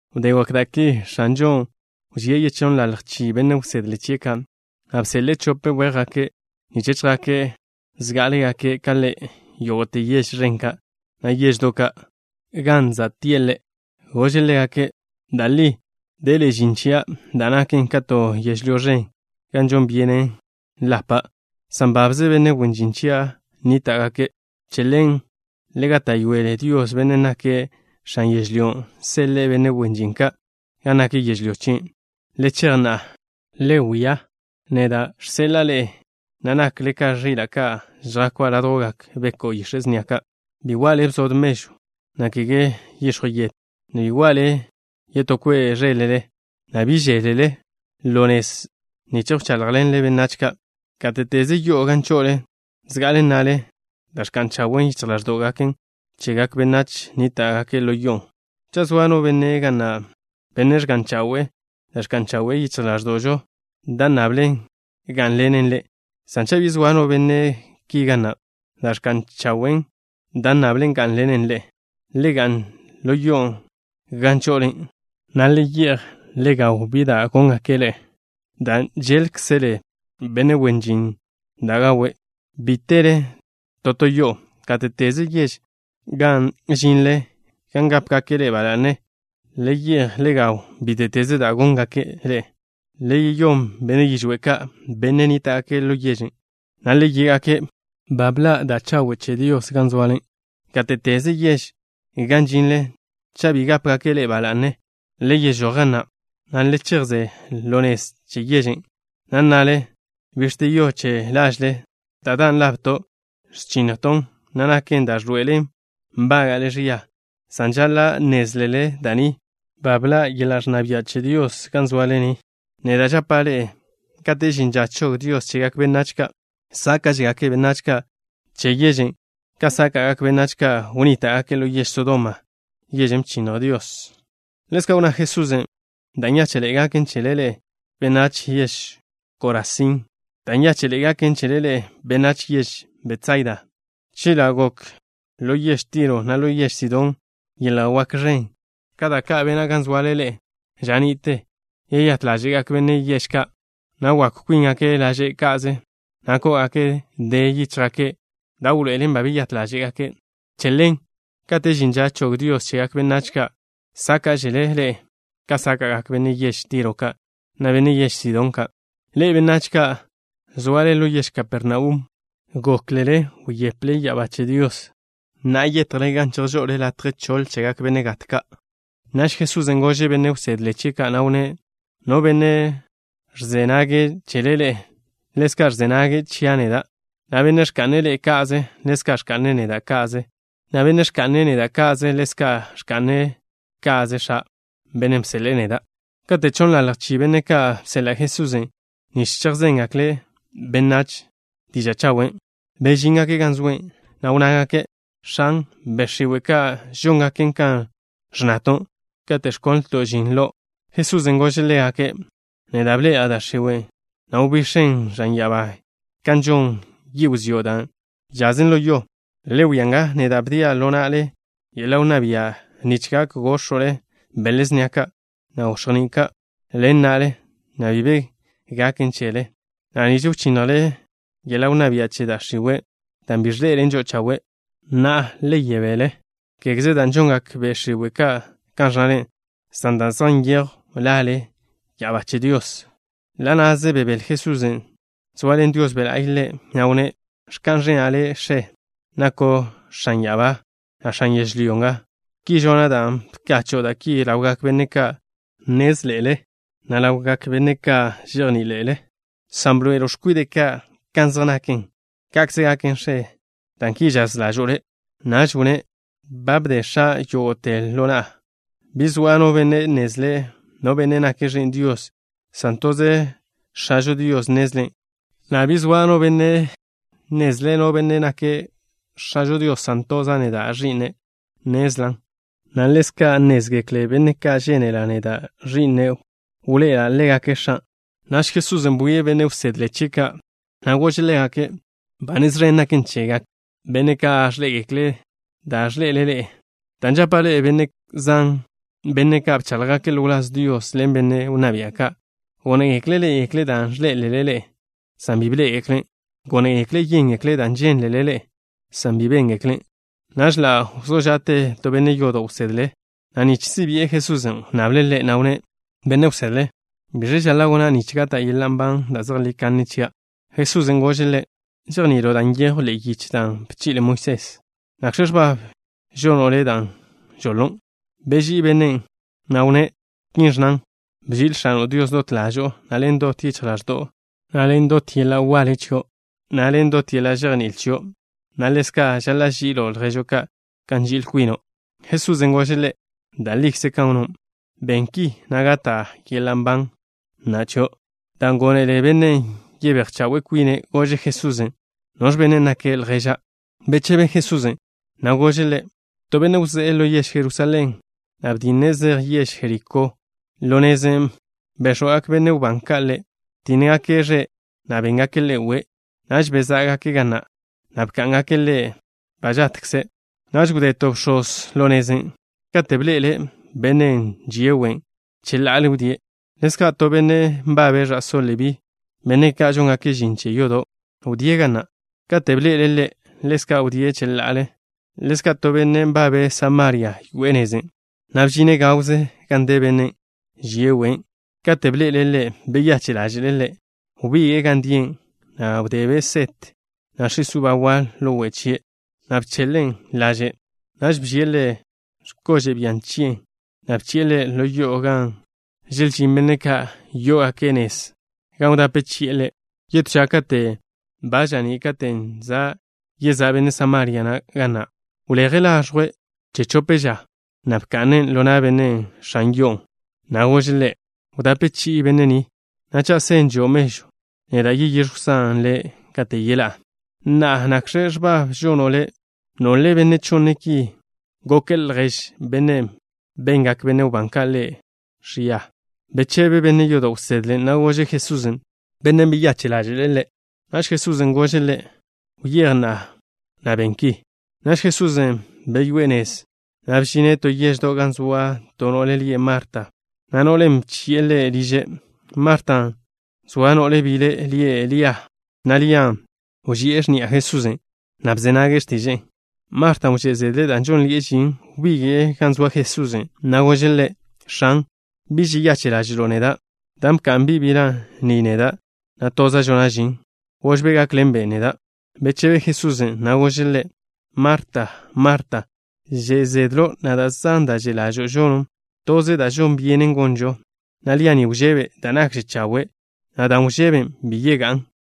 Wdé gok da' ki, X̱anžon' wžíe' yechonnḻalj chi benne' wsedle chie' ka', na' bseḻe'e chope wéjgake' nich chjake' zgá'alegake' ka Ḻe' yógo'te yež ẕen ka', na' yeždo' ka', gan za' tie' Ḻe'. Gože' ḻégake': —Da' li, deḻe'e žin chia', da' naken ka to yežlyó ẕen gan žon byenen ḻapa', san babze benne' wen žin chia' nníta'gake'. Che ḻen, le gáta'yoele Dios, Bennen' nake' X̱an yežlyón', seḻe'e benne' wen žin ka' gan nak yežlyó chien'. Le chej na'a. Le wia, neda' žseḻa'a ḻe'e, na' nakle ka ẕila' ka' zjakba' ládjwgak beko' yix̱e' snia ka'. Bi wa'le bzod mežw, na' kege yix̱jw yet, na' bi wa'le yetó kwe' ẕélele, na' bi žélele ḻo nez nich wcháḻjḻenle benách ka'. Gáte'teze yo'o gan cho'ole, zga'ale nnale: “Da' ẕka'n chawe' yichj ḻáẕdo'žo gaken chegak benách nníta'gake' yo'o ni.” Cha' zoa no benne' ga na', benne' ẕga'n chawe'e, da' ẕka'n chawe' yichj ḻáẕdo'žo da' nnablen gá'nḻenen ḻe', san cha' bi zoa no benne' ki ga na', da' ẕka'n chawen' da' nnablen gá'nḻenen ḻe'e. Le ga'n ḻo yo'o gan cho'ole, na' le ye'j le gaw bi da' gónngake' ḻe'e, dan' žéḻkzele benne' wen žin da' gawe'. Bi tele to to yo'o. Gáte'teze yež gan žinle, gan gápegake' ḻe'e ba la'ne, le ye'j le gaw bíte'teze da' gónngake' ḻe'e. Le yeyón benne' yižwé' ka', benne' nníta'gake' ḻo yežen', na' le ye'-gake': “Ba bḻa' da' ẕnna bia' Dios gan zoale.” Gáte'teze yež gan žinle, cha' bi gápegake' ḻe'e ba la'ne, le yežój ga na', na' le chejzé ḻo nez che yežen', na' nnale: “Bix̱te yo che lažle, da' dan' labto' ẕchinnjton', na' naken da' ẕḻoe'elen nbága'le ẕia, san žaḻa' nnézlele da' ni. Ba bḻa' da' ẕnna bia' Dios ga zoale ni.” Neda' žapa' ḻe'e, kate' žin ža chog Dios chegak benách ka', sáka'žegak benách ka' che yežen' ka sáka'gak benách ka' wnníta'gake' ḻo yež Sodoma, yežen' bchinnj Dios. Ḻezka' wnná Jesusen': —Da' nyáche'ḻe'e gaken chele ḻe'e, benách yež Korazín. Da' nyáche'ḻe'e gaken chele ḻe'e, benách yež Betsaida. Chela' gok ḻo yež Tiro, na' ḻo yež Sidón yeḻa' wak ẕen ka' ka da' ka' bena' gan zoale ḻe'e, ža ni'te yeyát ḻáže'gak benne' yež ka', na' wakw kwíngake' laže' ka'ze, na' kó'ogake' de yíchjgake', da' wḻoe'elen ba beyát ḻáže'gake'. Che ḻen, kate' žin ža chog Dios chegak benách ka', sáka'žele ḻe'e ka sáka'gak benne' yež Tiro ka', na' benne' yež Sidón ka'. Ḻe'e, benách ka' zoale ḻo yež Kapernaum. Gok chele kan wyeple gan cho'ogak benách ka' ya'abá che Dios. Na'a yetjle gan chejžo'ole latje choḻ chegak benne' gat ka'. Naž Jesusen' gože' benne' wsedle chie' ka', na' wnné': —No benne' ẕze nage' chele ḻe'e, ḻezka' ẕze nage' chia' neda', na' bennen' ẕka'ne' ḻe'e ka'ze, ḻezka' ẕka'ne' neda' ka'ze, na' bennen' ẕka'ne' neda' ka'ze, ḻezka' ẕka'ne' ka'ze X̱a', Bennen' bseḻe'e neda'. Kate' chonnḻalj chi benne' ka' bseḻa' Jesusen' nich chejzéngekle' benách diža' chawen' bežíngake' gan zoe', na' wnnágake': —X̱an, be' x̱iwe' ka' žóngaken kan ẕnnato' kate' ẕkonlto' žin lo'. Jesusen' gože' ḻégake': —Neda' bḻe'ela' da' x̱iwe', na' wbix̱en ẕan ya'abá kan žon yi' wzió', dan' žazen ḻo yo. Le wia nga, neda' bdia' ḻo na'le yeḻa' wnná bia' nich gak góxwle bele snia ka', na' gox̱jní' ka', ḻen na'le, na' bi be gaken chele, na' nich wchinnjle yeḻa' wnná bia' che da' x̱iwe', dan' bi ẕḻe'elen žo'o chawe'. Na'a, le yebél, kégeze dan' žongak be' x̱iwe' ka' kan ẕnnale, san dan' zej nyejw lale ya'abá che Dios. Ḻa' na'ze bebél Jesusen', zoaḻen Dios Be' La'y Ḻe', na' wnné': —Ẕka'n ẕena' Le', X̱e, nako' X̱an ya'abá, na' X̱an yežlyó nga. Ki žona' dan' bkacho'o da' ki ḻawgak benne' ka' žákgake' da' ẕenḻe'e, na' ḻawgak benne' sina' ka', san bḻoe'elo' x̱kwide' ka' kan zej naken. Ka'kze gaken, X̱e, dan' ki žaz ḻažo'o Le'. Naž wnné': —Ba bde X̱a' yógo'te ḻo na'a. Bi zoa no benne' nnezle' no benne' nake' Ẕi'n Dios, san toze X̱ažo Dios nnezlen', na' bi zoa no benne' nnezle' no benne' nake' X̱ažo Dios, san toza' neda', Ẕi'ne', nnezlan', na' ḻezka' nnézgekle benne' ka' žénela' neda', Ẕi'ne', wḻoe'ela' ḻégake' X̱a'. Naž Jesusen' bwie' benne' wsedle chie' ka', na' gože' ḻégake': —Ba nez ẕen naken chegak benne' ka' ẕḻé'egekle' da' ẕḻé'elele ḻe'e, dan' žapa' ḻe'e: benne' zan, benne' ka' bcháḻjgake' ḻo wláz Dios ḻen benne' wnná bia' ka', gónegekle' ḻé'egekle' da' ẕḻé'elele ḻe'e san bi bḻé'egeklen'. Gónegekle' yéngekle' da' žénlele ḻe'e, san bi béngeklen'. Naž ḻa' wzó ža'te to benne' yodo' wsedle, na' nich si' bi'e Jesusen', wnnable' Ḻe', na' wnné': —Benne' wsedle, ¿biẕe žaḻa' gona' nich gata' yeḻa' nban da' zejlí kanne chia'? Jesusen' gože' ḻe': —¿Žejni'ilo' da' nyejw ḻe'e yich, dan' bchi'le Moisés? ¿Nakx̱ x̱bab žono' le' dan' žoḻo'? Beží'i bennen', na' wnné': —Ki ẕnnan: “Bži'il X̱ano' Dios dot ḻažo'o, na' ḻen dot yichj ḻaẕdo'o, na' ḻen dot yeḻa' žon chio', na' ḻen dot yeḻa' žejní'il chio', na' ḻezka' žaḻa' ži'ilo' lježo' kan nži'il kwino'.” Jesusen' gože' ḻe': —Da' likze kan wnnó'. Ben ki, na' gata' yeḻa' nban na' chio'. Dan' gónele bennen' yebéj chawe' kwine', gože' Jesusen': —¿Noẕ benne' nake' lježa'? Bechebe Jesusen', na' gože' ḻe': —To benne' wzé'e ḻo yež Jerusalén, na' bdinne', zeje' yež Jerikó. Ḻo nezen' béx̱wgak benne' wbán ka' ḻe'. Btínnegake' ẕe', na' béngake' ḻe' we'. Naž bezá'gake' ga na', na' bká'ngake' ḻe' ba žatkze'. Naž wdé to bx̱oz ḻo nezen'. Kate' bḻe'ele' bennen' žie' we', cheḻa'ale wdíe'. Ḻezka' to benne' nbabe' ẕa'só Lebí, benne' ka' žóngake' žin che yodo', wdíe' ga na'. Kate' bḻe'ele' ḻe', ḻezka' wdíe' cheḻa'ale. Ḻezka' to benne' nbabe' Samaria yoe'e nezen', na' bžine' gawze gan de bennen' žie' we'. Kate' bḻe'ele' ḻe', beyache' ḻáže'le' ḻe'. Wbige'e gan die', na' bdebe' set, na' x̱is uba waḻ ḻo we' chie', na' bcheḻen' laže'. Naž bžie' ḻe' x̱kože' bia chie', na' bchi'e ḻe' ḻo yo'o gan želžín benne' ka' yó'ogake' nez, gan wdape chi'e ḻe'. Yetó ža kate' ba ža'ní', katen' za' yezá' benne' Samaria na' ga na', wleje' laẕjwe' che chope ža, na' bka'nen' ḻo na' benne' x̱an yo'on', na' gože' ḻe': “Wdape chi'i benne' ni, na' cha' senžo' mežw, neda' yeyiẕjwan' le' kate' yeḻá'a.” Na'a, ¿nakx̱ x̱bab žono' le'? ¿Nole benne' chonne ki goke' ljež bennen' bengak benne' wbán ka' ḻe' ẕia? Bechebe benne' yodo' wsedlen', na' gože' Jesusen': —Bennen' beyache' ḻáže'le' ḻe'. Naž Jesusen' gože' ḻe': —Wyéj na'a, na' ben ki. Naž Jesusen' beyoé'e nez, na' bžine' to yeždo' gan zoa to no'le lie' Marta, na' no'len' bchi'e Ḻe' liže'. Martan' zoa no'le bile' lie' Lia, na' Lian' wži'e x̱ni'a Jesusen', na' bze nage' x̱tiže'e. Martan' wžé' zedle' dan' žónḻi'e žin. Wbige'e gan zoa Jesusen', na' gože' Ḻe': —X̱an, ¿bi žeyache' ḻáže'lo' neda' dan' bka'n bi' bila' ni neda', na' toza' žona' žin? Gož-be' gákḻenbe' neda'. Bechebe Jesusen', na' gože' ḻe': —Marta, Marta, že' zedlo', na' da' zan da' že' ḻažo'o žonon'. Toze da' žon byenen gonžon, na' Lia ni wžebe' dan' nakže chawe', na' dan' wžebe' bi yegá'n.